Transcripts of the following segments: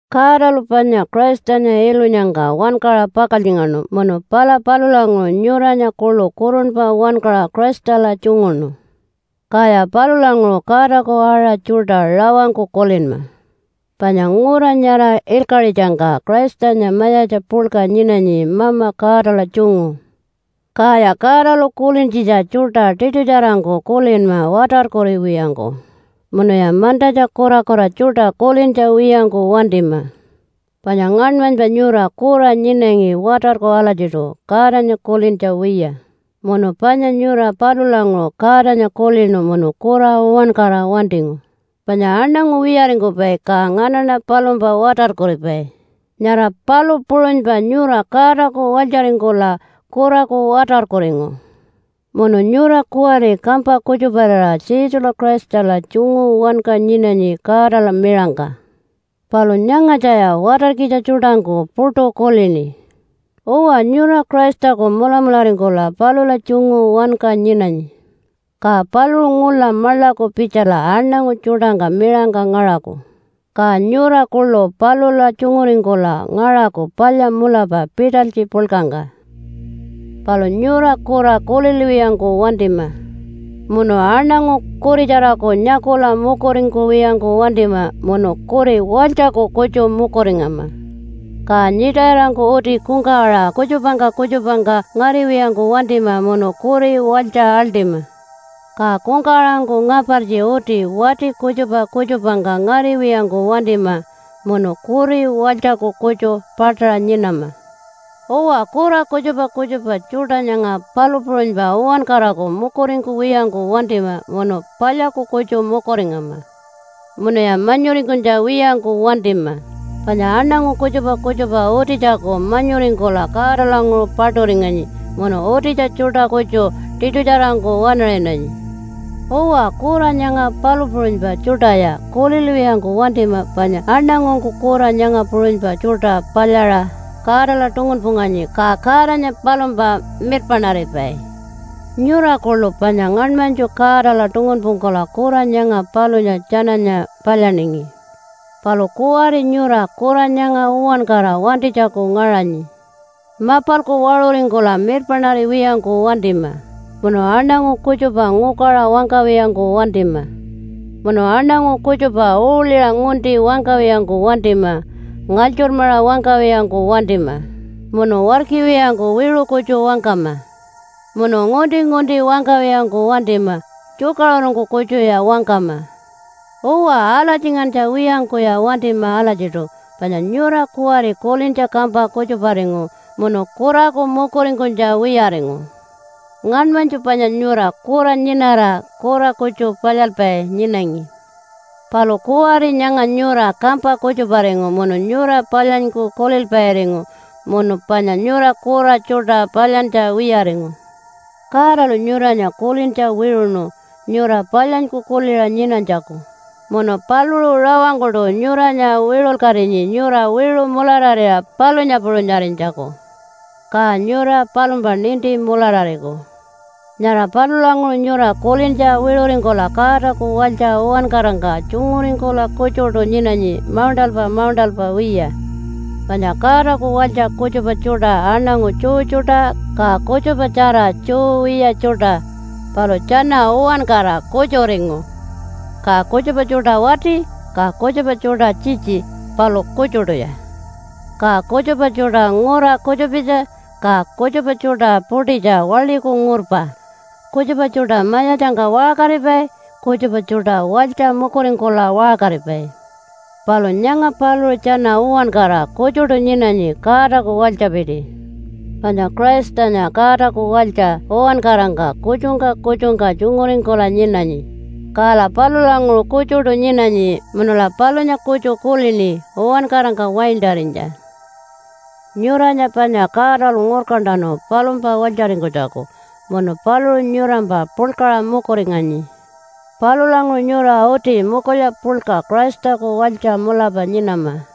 Godalu panya Christanya ilunyangka wankaṟa pakaltjingaṉu munu pala palulanguṟu nyuranya kuḻu kurunpa wankaṟa Christala tjunguṉu. Kaya palulanguṟu Godaku aṟa tjuṯa rawangku kulinma. Panya ngura nyara ilkaṟitjangka Christanya mayatja puḻka nyinanyi Mama Godala tjungu. Kaya Godalu kulintjitja tjuṯa tiṯutjarangku kulinma watarkuriwiyangku, munuya mantatja kurakura tjuṯa kulintja wiyangku wantima. Panya ngaṉmanypa nyura kura nyinangi watarku alatjiṯu Godanya kulintja wiya, munu panya nyura palulanguṟu Godanya kulinu munu kura uwankara wantingu, panya aṉangu wiyaringkupai ka nganaṉa palumpa watarkuripai, nyara palu puṟunypa nyura Godaku walytjaringkula kuraku watarkuringu. Munu nyura kuwari kampa kutjuparira Jesula Christala tjungu wanka nyinanyi Godala miṟangka. Palu nyangatjaya watarkitja tjuṯangku puṯu kulini. Uwa nyura Christaku mulamularingkula palula tjungu wanka nyinanyi. Ka paluṟu ngula maḻaku pitjala aṉangu tjuṯangka miṟangka ngaṟaku, ka nyura kuḻu palula tjunguringkula ngaṟaku palya mulapa pitalytji puḻkangka. Palu nyura kura kulilwiyangku wantima. Munu aṉangu kuritjaraku nyakula mukuringkuwiyangku wantima, munu kuri walytjaku kutju mukuringama. Ka nyiṯayirangku uti kungkawaṟa kutjupangka kutjupangka ngariwiyangku wantima munu kuri walytja aḻṯima. Ka kungkawaṟangku ngapartji uti wati kutjupa kutjupangka ngariwiyangku wantima munu kuri walytjaku kutju paṯaṟa nyinama. Uwa kura kutjupa kutjupa tjuṯa nyanga palu puṟunypa uwankaraku mukuringkuwiyangku wantima munu palyaku kutju mukuringama. Munuya manyuringkunytja wiyangku wantima, panya aṉangu kutjupa kutjupa utitjaku manyuringkula Godalanguṟu paṯuringanyi munu utitja tjuṯa kutju tiṯutjarangku waṉaṟinanyi. Uwa kura nyanga palu puṟunypa tjuṯaya kulilwiyangku wantima panya aṉangungku kura nyanga puṟunypa tjuṯa palyaṟa Godala tungunpunganyi, ka Godanya palumpa mirpaṉaripai. Nyura kuḻu panya ngaṉmanytju Godala tungunpungkula kura nyanga palunya tjananya palyaningi. Palu kuwari nyura kura nyanga uwankara wantinytjaku ngaṟanyi. Mapalku waṟuringkula mirpaṉariwiyangku wantima, munu aṉangu kutjupa ngukaṟa wangkawiyangku wantima, munu aṉangu kutjupa uuḻiṟa ngunti wangkawiyangku wantima, ngalytjurmaṟa wangkawiyangku wantima, munu warkiwiyangku wiṟu kutju wangkama, munu ngunti-ngunti wangkawiyangku wantima tjukaṟurungku kutjuya wangkama. Uwa, alatjingantja wiyangkuya wantima alatjiṯu, panya nyura kuwari kulintja kampa kutjuparingu munu kuraku mukuringkunytja wiyaringu. Ngaṉmanytju panya nyura kura nyinara kura kutju palyalpai nyinangi. Palu kuwari nyanga nyura kampa kutjuparingu munu nyura palyanyku kulilpairingu, munu panya nyura kura tjuṯa palyantja wiyaringu. Godalu nyuranya kulintja wiṟuṉu nyura palyanyku kuliṟa nyinanytjaku, munu paluṟu rawangkuṯu nyuranya wiṟulkatinyi nyura wiṟu mulararira palunya puṟunyarinytjaku. Ka nyura palumpa ninti mularariku. Nyara palulanguṟu nyura kulintja wiṟuringkula Godaku walytja uwankarangka tjunguringkula kutjuṯu nyinanyi mauṉṯalpa mauṉṯalpa wiya. Panya Godaku walytja kutjupa tjuṯa aṉangu Jew tjuṯa, ka kutjupatjara Jew wiya tjuṯa, palu tjana uwankara kutjuringu. Ka kutjupa tjuṯa wati, ka kutjupa tjuṯa tjitji, palu kutjuṯuya. Ka kutjupa tjuṯa ngura kutjupitja, ka kutjupa tjuṯa puṯitja waḻiku ngurpa, kutjupa tjuṯa mayatjangka waṟkaripai, kutjupa tjuṯa walytja mukuringkula waṟkaripai, palu nyanga paluṟu tjana uwankara kutjuṯu nyinanyi Godaku walytjapiti. Panya Christanya Godaku walytja uwankarangka kutjungka kutjungka tjunguringkula nyinanyi, kala palulanguṟu kutjuṯu nyinanyi munula palunya kutju kulini uwankarangka waintarinytja. Nyuranya panya Godalu ngurkantanu palumpa walytjaringkunytjaku. Munu paluṟu nyurampa puḻkaṟa mukuringanyi. Palulanguṟu nyura uti mukulya puḻka Christaku walytja mulapa nyinama.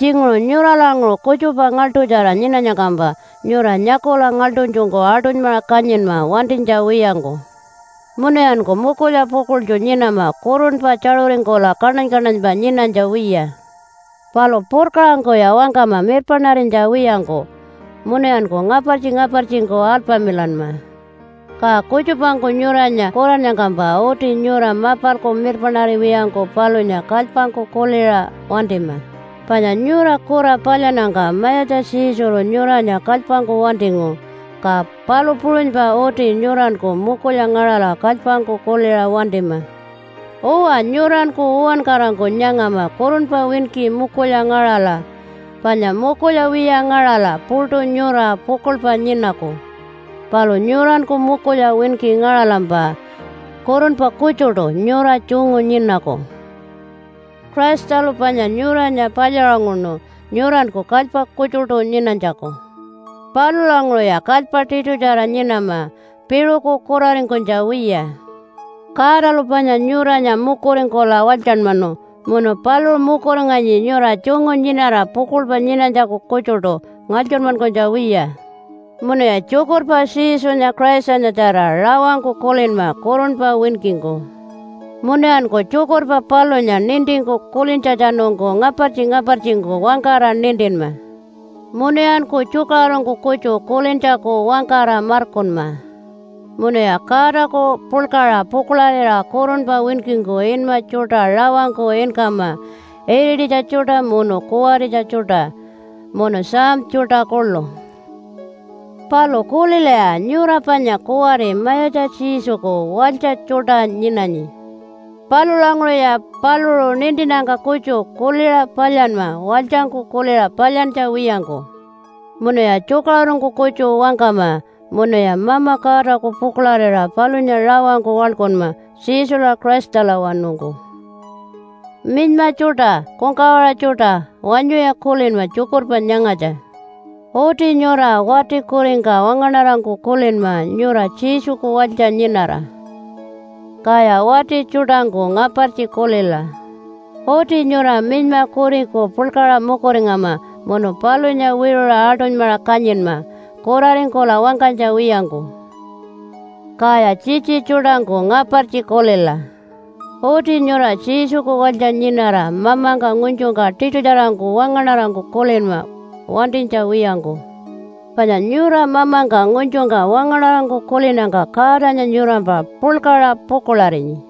Tjinguṟu nyuralanguṟu kutjupa ngaḻṯutjara nyinanyangkampa nyura nyakula ngaḻṯunytjungku aṯunymaṟa kanyinma wantinytja wiyangku. Munuyanku mukulya pukuḻtju nyinama kurunpa tjaṟuringkula kaṉany-kaṉanypa nyinanytja wiya. Palu purkaṟangkuya wangkama mirpaṉarinytja wiyangku, munuyanku ngapartji-ngapartjingku alpamilanma. Ka kutjupangku nyuranya kurannyangkampa uti nyura mapalku mirpaṉariwiyangku palunya kalypangku kuliṟa wantima, panya nyura kura palyannyangka Mayatja Jesulu nyuranya kalypangku wantingu, ka palu puṟunypa uti nyuranku mukulya ngaṟala kalypangku kuliṟa wantima. Uwa nyuranku uwankarangku nyangama kurunpa winki mukulya ngaṟala, panya mukulya wiya ngaṟala puṯu nyura pukuḻpa nyinaku. Palu nyuranku mukulya winki ngaṟalampa kurunpa kutjuṯu nyura tjungu nyinaku. Christalu panya nyuranya palyaṟunguṉu nyuranku kalypa kutjuṯu nyinanytjaku. Palulanguṟuya kalypa tiṯutjara nyinama piṟuku kuraringkunytja wiya. Godalu panya nyuranya mukuringkula walytjanmanu munu paluṟu mukuringanyi nyura tjungu nyinara pukuḻpa nyinanytjaku kutjuṯu ngalytjurmankunytja wiya. Munuya tjukurpa Jesunya Christanyatjara rawangku kulinma kurunpa winkingku. Munuyanku tjukurpa palunya nintingku kulintjatjanungku ngapartji-ngapartjingku wangkara nintinma, munuyanku tjukaṟurungku kutju kulintjaku wangkara markunma. Munuya Godaku puḻkaṟa pukuḻarira kurunpa winkingku inma tjuṯa rawangku inkama irititja tjuṯa munu kuwaritja tjuṯa, munu psalm tjuṯa kuḻu. Palu kulilaya! Nyura panya kuwari Mayatja Jesuku walytja tjuṯa nyinanyi. Palulanguṟuya paluṟu nintinnyangka kutju kuliṟa palyanma walytjangku kuliṟa palyantja wiyangku. Munuya tjukaṟurungku kutju wangkama. Munuya Mama Godaku pukuḻarira palunya rawangku waḻkunma Jesula Christalawanungku. Minyma tjuṯa, kungkawaṟa tjuṯa wanyuya kulinma tjukurpa nyangatja! Uti nyura wati kuringka wangaṉarangku kulinma nyura Jesuku walytja nyinara. Kaya wati tjuṯangku ngapartji kulila! Uti nyura minyma kuriku puḻkaṟa mukuringama munu palunya wiṟuṟa aṯunymaṟa kanyinma kuraringkula wangkanytja wiyangku. Kaya tjitji tjuṯangku ngapartji kulila! Uti nyura Jesuku walytja nyinara mamangka ngunytjungka tiṯutjarangku wangaṉarangku kulinma wantinytja wiyangku. Panya nyura mamangka ngunytjungka wangaṉarangku kulinnyangka Godanya nyurampa puḻkaṟa pukuḻarinyi.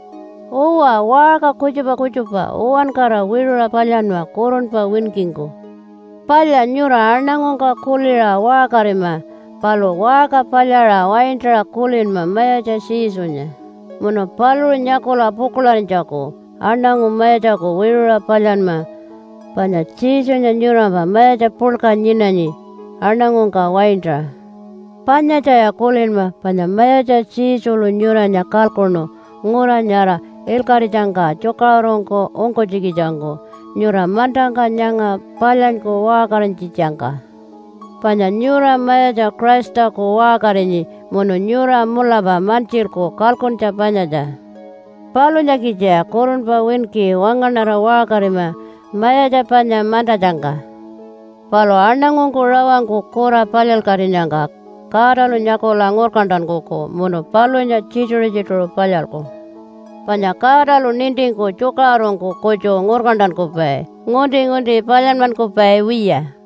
Uwa, waṟka kutjupa kutjupa uwankara wiṟuṟa palyanma kurunpa winkingku. Palya nyura aṉangungka kuliṟa waṟkarima, palu waṟka palyaṟa waintaṟa kulinma Mayatja Jesunya munu paluṟu nyakula pukuḻarinytjaku aṉangu mayatjaku wiṟuṟa palyanma, panya Jesunya nyurampa mayatja puḻka nyinanyi, aṉangungka waintaṟa. Panyatjaya kulinma, panya Mayatja Jesulu nyuranya kalkuṉu ngura nyara ilkaṟitjangka tjukaṟurungku ungkunytjikitjangku nyura mantangka nyanga palyanyku waṟkarinytjitjangka. Panya nyura Mayatja Christaku waṟkarinyi munu nyura mulapa mantjilku kalkuntja panyatja. Palunyakitjaya kurunpa winki wangaṉara waṟkarima mayatja panya mantatjangka. Palu aṉangungku rawangku kura palyalkatinyangka Godalu nyakula ngurkantankuku munu palunya tjituṟu-tjituṟu palyalku. Panya Godalu nintingku tjukaṟurungku kutju ngurkantankupai ngunti-ngunti palyanmankupai wiya.